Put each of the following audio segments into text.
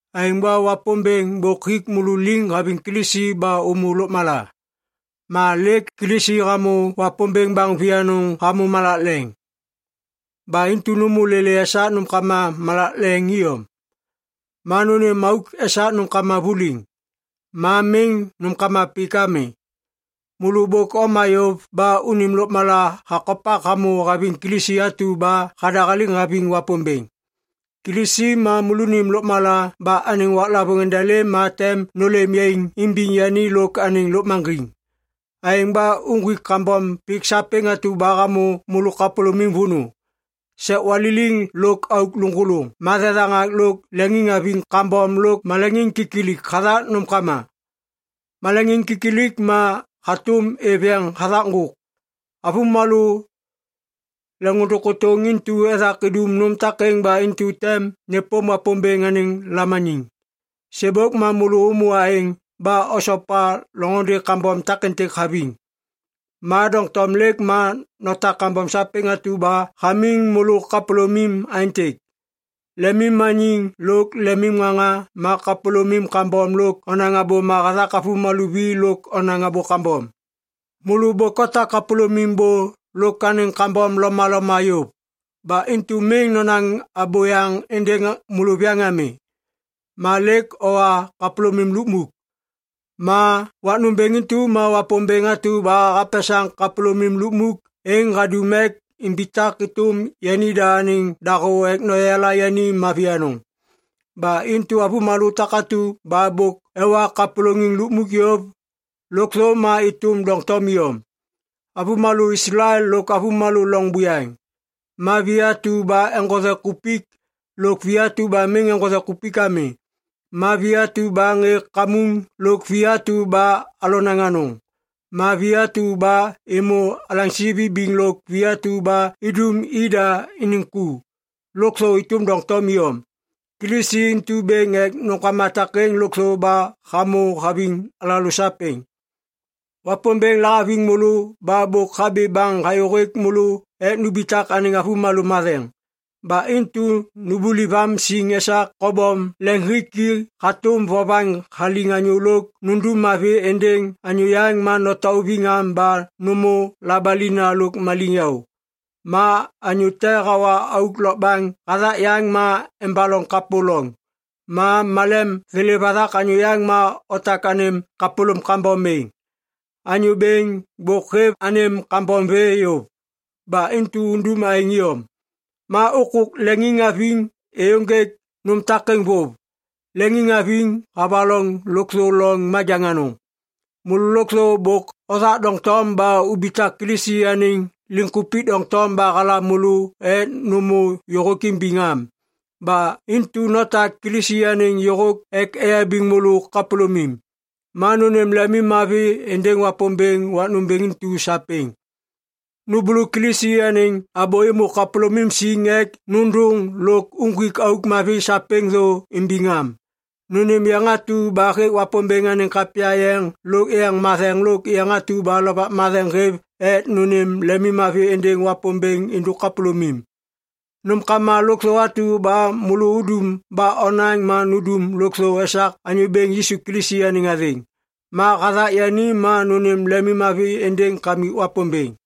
Aêŋ ba Wapômbêŋ bôk hik môlô liŋ haviŋ Kilisi ba ômô lôkmala. Ma lêk Kilisi hamô Wapômbêŋ baŋ vianôŋ hamô malak leŋ. Ba intu nômô lêlê esak nômkama malak leŋ iyom. Ma nônêm auk esak nômkama vuliŋ, ma miŋ nômkama pik ami. Môlô bôk oma yôv ba unim lôkmala hakopak hamô haviŋ Kilisi atu ba hadahaliŋ haviŋ Wapômbêŋ. Kilisi ma môlônim lôkmala ba anêŋ waklavôŋ endelêm ma tem nôlêm yaiŋ imbiŋ yani lôk anêŋ lôkmaŋgiŋ. Aêŋ ba uŋgwik kambom pik sapêŋ atu ba hamô môlô kapôlômim vônô: sek waliliŋ lôk auk lôŋgôlôŋ ma thethaŋak lôk leŋiŋhaviŋ kambom lôk maleŋiŋkilik hathak nômkama. Maleŋkilik ma hatôm êv yeŋ hathak ŋgôk. Avômalô leŋôndôŋ kôtôŋ intu ethak idum nôm takêŋ ba intu tem nêpôm Wapômbêŋ anêŋ lamaniŋ. Sêbôk ma môlô ômô aêŋ ba osopa loŋôndê kambom takêntêk haviŋ. Ma doŋtom lêk ma notak kambom sapêŋ atu ba hamiŋ môlô kapôlômim aêntêk: lemimmaniŋ lôk lemimŋaŋa ma kapôlômim kambom lôk onaŋ abôma hathak avômalô vi lôk onaŋ abô kambom. Môlô bôk otak kapôlômim bô lôk anêŋ kambom lomaloma yôv. Ba intu miŋ nonaŋ abôyaŋ êndêŋ môlôviyaŋ ami. Ma lêk owa kapôlômim lukmuk. Ma wak nômbêŋ intu ma Wapômbêŋ atu ba hapesaŋ kapôlômim lukmuk êŋ hadum ek imbitak êtôm yanida anêŋ dahô ek noyala yani mavi anôŋ. Ba intu avômalô takatu ba bôk ewa kapôlôŋiŋ lukmuk yôv, lôkthô ma êtôm doŋtom iyom. Avômalô Islael lôk avômalô loŋ buyaŋ, ma vi atu ba eŋgothe kupik lôk vi atu ba miŋ eŋgothe ami, ma vi atu ba ŋê kamuŋ lôk vi atu ba alonaŋ anôŋ, ma vi atu ba êmô alaŋsi vibiŋ lôk vi atu ba idum ida iniŋ ku, lôkthô êtôm doŋtom iyom. Kilisi intu bêŋ ek nômbêŋ takêŋ lôkthô ba hamô haviŋ alalô sapêŋ. Wapômbêŋ lahaviŋ môlô ba bôk habi baŋ hayô hêk môlô ek numbitak anêŋ avômalô matheŋ. Ba intu numbuliv am siŋ esak kobom leŋiŋhiki hatôm vovaŋ haliŋ anyô lôk nundum mavi êndêŋ anyô yaŋ ma notauviŋ am ba nômô labalina lôk maliŋyaô. Ma anyô te hawa auk lokbaŋ hathak yaŋ ma embaloŋ kapô loŋ. Ma malem thêlêv hathak anyô yaŋ ma otak anêm kapôlôm kambom êŋ. Anyô Bêŋ bôk hêv anêm kambom vê yôv, ba intu undum aêŋ iyom. Ma ôkôk leŋiŋhaviŋ êyôŋgêk nôm takêŋ vôv. Leŋiŋhaviŋ havaloŋ lôkthô loŋ majaŋ anôŋ. Môlô lôkthô bôk othak doŋtom ba ubitak Kilisi anêŋ liŋkupik doŋtom ba halam môlô ek nômô yôhôk imbiŋam. Ba intu notak Kilisi anêŋ yôhôk ek eyabiŋ môlô kapôlômim. Ma nônêm lemimmavi êndêŋ Wapômbêŋ wak nômbêŋ intu sapêŋ. Nômbôlô Kilisi anêŋ abô êmô kapôlômim siŋ ek nôndôŋ lôk uŋgwik auk mavi sapêŋ thô imbiŋ am. Nônêm yeŋ atu ba hêk Wapômbêŋ anêŋ kapya yeŋ lôk yeŋ matheŋ lôk yeŋ atu ba Lovak Matheŋ hêv ek nônêm lemimmavi êndêŋ Wapômbêŋ êndôk kapôlômim. Nômkama lôkthô atu ba môlô udum ba onaŋ ma nundum lôkthô esak Anyô Bêŋ Yisu Kilisi anêŋ athêŋ. Ma hathak yani ma nônêm lemimmavi êndêŋ Kamik Wapômbêŋ.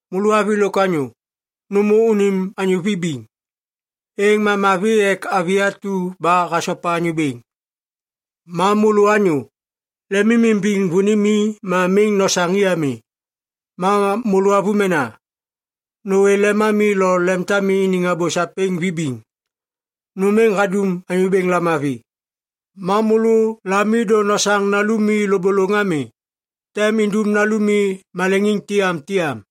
Môlô avi lôk anyô, nômô unim anyô vibiŋ. Êŋ ma mavi ek avi atu ba hasopa Anyô Bêŋ. Ma môlô anyô, lemimimbiŋ vônimi ma miŋ nosaŋ i ami. Ma môlô avômena, nôwê lemami lo lemtami iniŋ abô sapêŋ vibiŋ. Nôm êŋ hadum Anyô Bêŋ lamavi. Ma môlô lami miŋ nosaŋ i kakapuk ami, êŋ ma tem undum nalumi maleŋiŋ tiyamtiyam.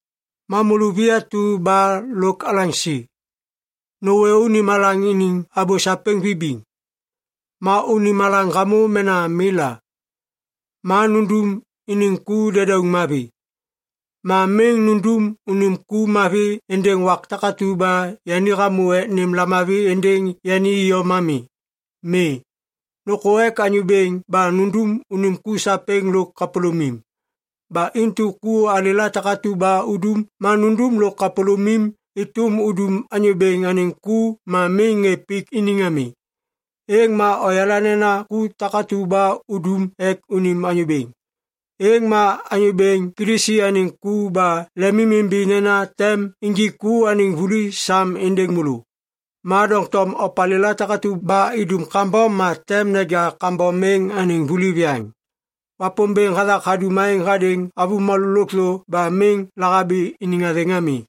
Ma môlô vi atu ba lôk alaŋsi, nôwê unim alaŋ iniŋ abô sapêŋ vibiŋ. Ma unim alaŋ hamô mena mi la, ma nundum iniŋ ku dedauŋ mavi. Ma miŋ nundum unim ku mavi êndêŋ wak takatu ba yani hamô ek nêm lamavi êndêŋ yani iyom ami. Mi, nôkô ek Anyô Bêŋ ba nundum unim ku sapêŋ lôk kapôlômim. Ba intu ku alêla takatu ba udum ma nundum lôk kapôlômim êtôm udum Anyô Bêŋ anêŋ ku ma miŋ ŋê pik iniŋ ami. Êŋ ma oyala nena ku takatu ba udum ek unim anyô bêŋ, êŋ ma Anyô Bêŋ Kilisi anêŋ ku ba lemimimbi nena tem injik ku anêŋ vuli sam êndêŋ môlô. Ma doŋtom opalêla takatu ba idum kambom ma tem neja kambom êŋ anêŋ vuli viyaŋ. Wapômbêŋ hathak hadum aêŋ hadêŋ avômalô lôkthô ba miŋ lahabi iniŋ athêŋ ami.